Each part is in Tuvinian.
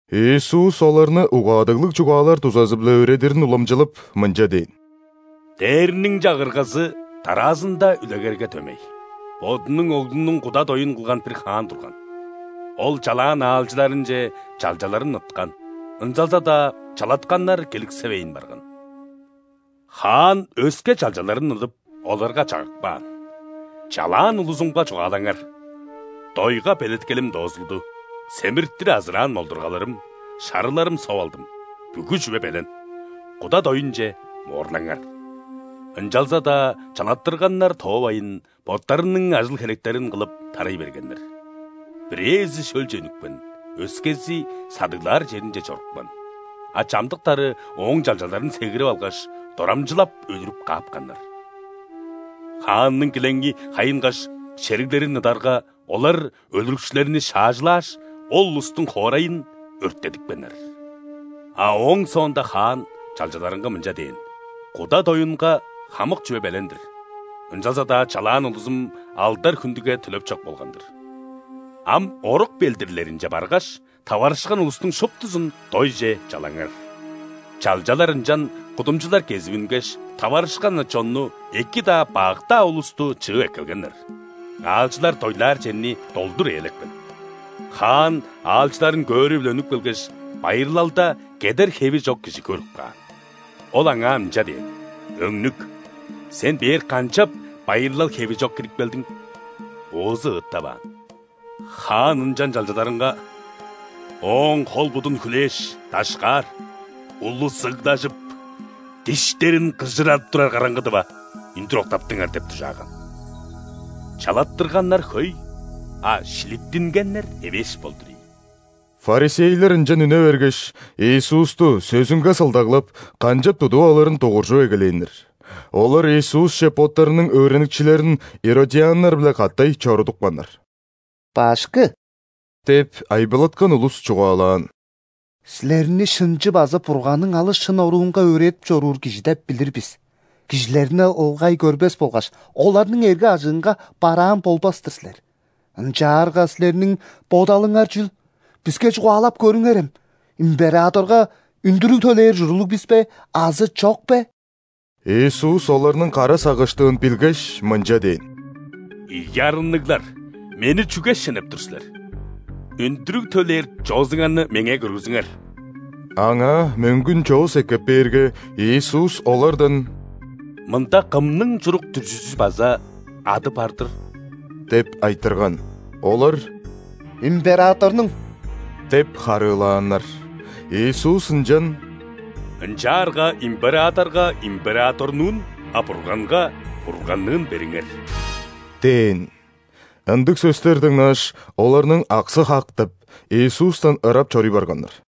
Иисус оларны угаадыглыг чугаалар дузазы-биле өөредирин уламчылап, мынча дээн: «Дээрниң Чагыргазы дараазында үлегерге дөмей. Бодунуң оглунуң куда доюн кылган бир хаан турган. Ол чалаан аалчыларынче чалчаларын ыткан, ынчалза-даа чалатканнар келиксевейн барган. Хаан өске чалчаларын ыдып, оларга чагып каан: „Чалаан улузумга чугаалаңар: ‘Дойга белеткелим доозулду, семиртир азыраан молдургаларым, шарыларым соп алдым, бүгү чүве белен. Куда доюнче моорлаңар’“. Ынчалза-даа чалаттырганнар тоовайн, боттарының ажыл-херектерин кылып, тарай бергеннер. Бирээзи шөлче үнүпкен, өскези садыглаар черинче чорупкан, а чамдыктары ооң чалчаларын сегирип алгаш, дорамчылап өлүрүп каапканнар. Хаанның килеңи хайынгаш, шериглерин ыдарга, олар өлүрүкчүлерни шаажылааш, ол улустуң хоорайын өрттедипкеннер. А ооң соонда хаан чалчаларынга мынча дээн: „Куда доюнга хамык чүве белен-дир, ынчалза-даа чалаан улузум алдар-хүндүге төлеп чок болган-дыр. Ам орук белдирлеринче баргаш, таварышкан улустуң шуптузун дойже чалаңар“. Чалчалар ынчан кудумчулар кезип үнгеш, таварышкан-на чонну: эки-даа, бак-даа улусту чыып эккелгеннер. Аалчылар дойлаар черни долдур ээлепкен. Хаан аалчыларын көөрү-биле үнүп келгеш, байырлалда кедер хеви чок кижи көрүп каан. Ол аңаа мынча дээн: „Өңнүк, сен бээр канчап байырлал хеви чок кирип келдиң?“ Оозу ыыттаваан. Хаан ынчан чалчаларынга: „Ооң хол, будун хүлээш, дашкаар, улус ыглажып, диштерин кыжырадып турар караңгыдыва, үндүр октаптыңар“ – деп дужааган. Чалаттырганнар хөй, а шилиттингеннер эвээш болдур ийин». ·Фарисейлер ынчан үне бергеш, Иисусту, сөзүнге сылдаглап, канчап тудуп алырын дугуржуп эгелээннер. Олар Иисусче боттарының өөреникчилерин иродианнар-биле катай чорудупканнар. «Башкы! – деп, айбылаткан улус чугаалаан. – Силерни шынчы база Бурганның алыс шын оруунга өөредип чоруур кижи деп билир бис. Кижилерни ылгай көрбес болгаш, оларның эрге-ажыынга бараан болбас-тыр силер. Ынчаарга Силерниң бодалыңар чүл, биске чугаалап көрүңерем: императорга үндүрүг төлээр ужурлуг бис бе азы чок бе?» Иисус оларның кара сагыштыын билгеш, мынча дээн: «Ийи арынныглар, Мени чүге шенеп тур силер? Үндүрүг төлээр чоозуңарны Меңээ көргүзүңер». Аңаа мөңгүн чоос эккеп бээрге, Иисус олардан: «Мында кымның чурук-дүрзүзү база ады бар-дыр?» – деп айтырган. Олар: «Императорнуң» – деп харыылааннар. Иисус ынчан: «Ынчаарга императорга – императорнуун, а Бурганга – Бурганныын бериңер» – дээн. Ындыг сөстер дыңнааш, оларның аксы хак деп, Иисустан ырап чоруй барганнар.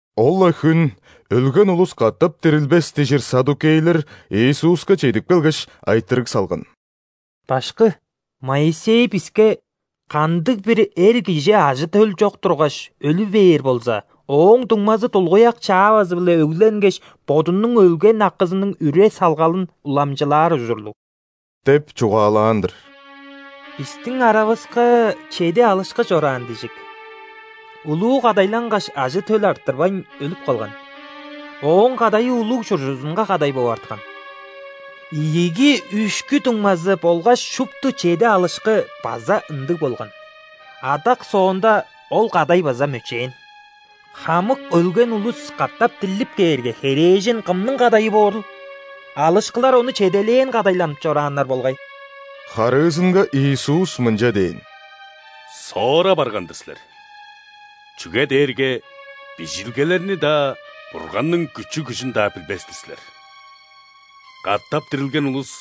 Ол-ла хүн «Өлген улус катап дирилбес» дижир ·саддукейлер Иисуска чедип келгеш, айтырыг салган: «Башкы, Моисей биске: „Кандыг-бир эр кижи ажы-төл чок тургаш, өлү бээр болза, ооң дуңмазы дулгуяк чаавазы-биле өгленгеш, бодунуң өлген акызының үре-салгалын уламчылаар ужурлуг“ – деп чугаалаан-дыр. Бистиң аравыска чеди алышкы чораан дижик. Улуу кадайлангаш, ажы-төл арттырбайн, өлүп калган. Ооң кадайы улуг чуржузунга кадай бооп арткан. Ийиги, үшкү дуңмазы болгаш шупту чеди алышкы-биле база ындыг болган. Адак соонда ол кадай база мөчээн. Хамык өлген улус катап дирлип кээрге, херээжен кымның кадайы боорул? Алышкылар ону чеделээн кадайланып чорааннар болгай». Харыызынга Иисус мынча дээн: «Соора барган-дыр силер, чүге дээрге Бижилгелерни-даа, Бурганның күчү-күжүн-даа билбес-тир силер. Катап дирилген улус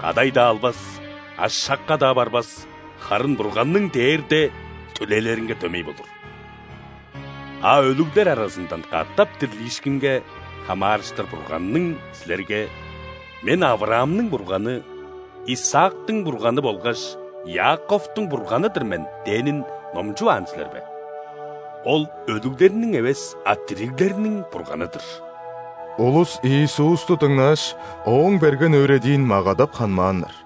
кадай-даа албас, ашакка-даа барбас, харын Бурганның дээрде төлээлеринге дөмей болур. А өлүглер аразындан катап дирлиишкинге хамаарыштыр Бурганның силерге: „Мен – Авраамның Бурганы, Исаактың Бурганы болгаш Иаковтуң Бурганы-дыр мен“ – дээнин номчуваан силер бе? Ол – өлүглерниң эвес, а дириглерниң Бурганы-дыр». Улус Иисусту дыңнааш, Ооң берген өөредиин магадап ханмааннар.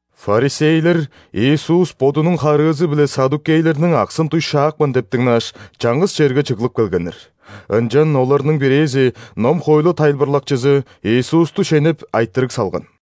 ·Фарисейлер Иисус Бодунуң харыызы-биле ·саддукейлерниң аксын дуй шаапкан деп дыңнааш, чаңгыс черге чыглып келгеннер. Ынчан оларның бирээзи, ном-хоойлу тайылбырлакчызы, Иисусту шенеп, айтырыг салган: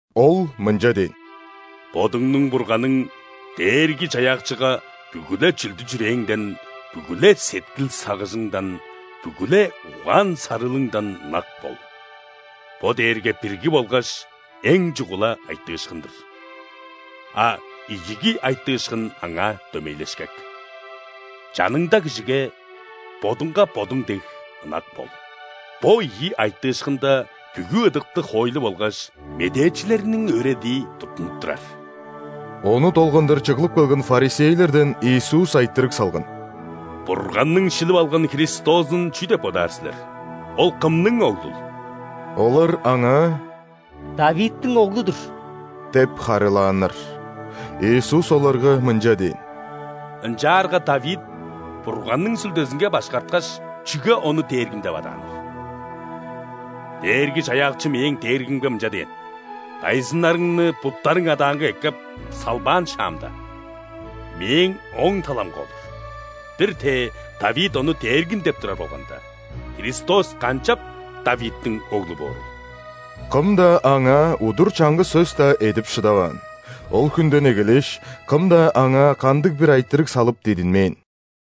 Ол мынча дээн: «„Бодуңнуң Бурганың Дээрги-Чаяакчыга бүгү-ле чүлдү-чүрээңден, бүгү-ле сеткил-сагыжыңдан, бүгү-ле угаан-сарыылыңдан ынак бол“. Бо дээрге бирги болгаш эң чугула айтыышкын-дыр. А ийиги айтыышкын аңаа дөмейлешкек: „Чаныңда кижиге бодуңга бодуң дег ынак бол“. Бо ийи айтыышкында бүгү ыдыктыг хоойлу болгаш медээчилерниң өөредии туттунуп турар». Ону долгандыр чыглып келген ·фарисейлерден Иисус айтырыг салган: «Бурганның шилип алган Христозун чүү деп бодаар силер: Ол кымның Оглул?» Олар Аңаа: «·Давидтиң Оглу-дур» – деп харыылааннар. Иисус оларга мынча дээн: «Ынчаарга Давид Бурганның Сүлдезинге башкарткаш, чүге Ону Дээргим деп адааныл: „Дээрги-Чаяакчы мээң Дээргимге мынча дээн:‘Дайзыннарыңны буттарың адаанга эккеп салбаан шаамда,Мээң оң таламга олур’“. Бир-тээ Давид Ону Дээргим деп турар болганда, Христос канчап Давидтиң Оглу боорул?» Кым-даа Аңаа удур чаңгыс сөс-даа эдип шыдаваан. Ол хүнден эгелээш, кым-даа Аңаа кандыг-бир айтырыг салып дидинмээн.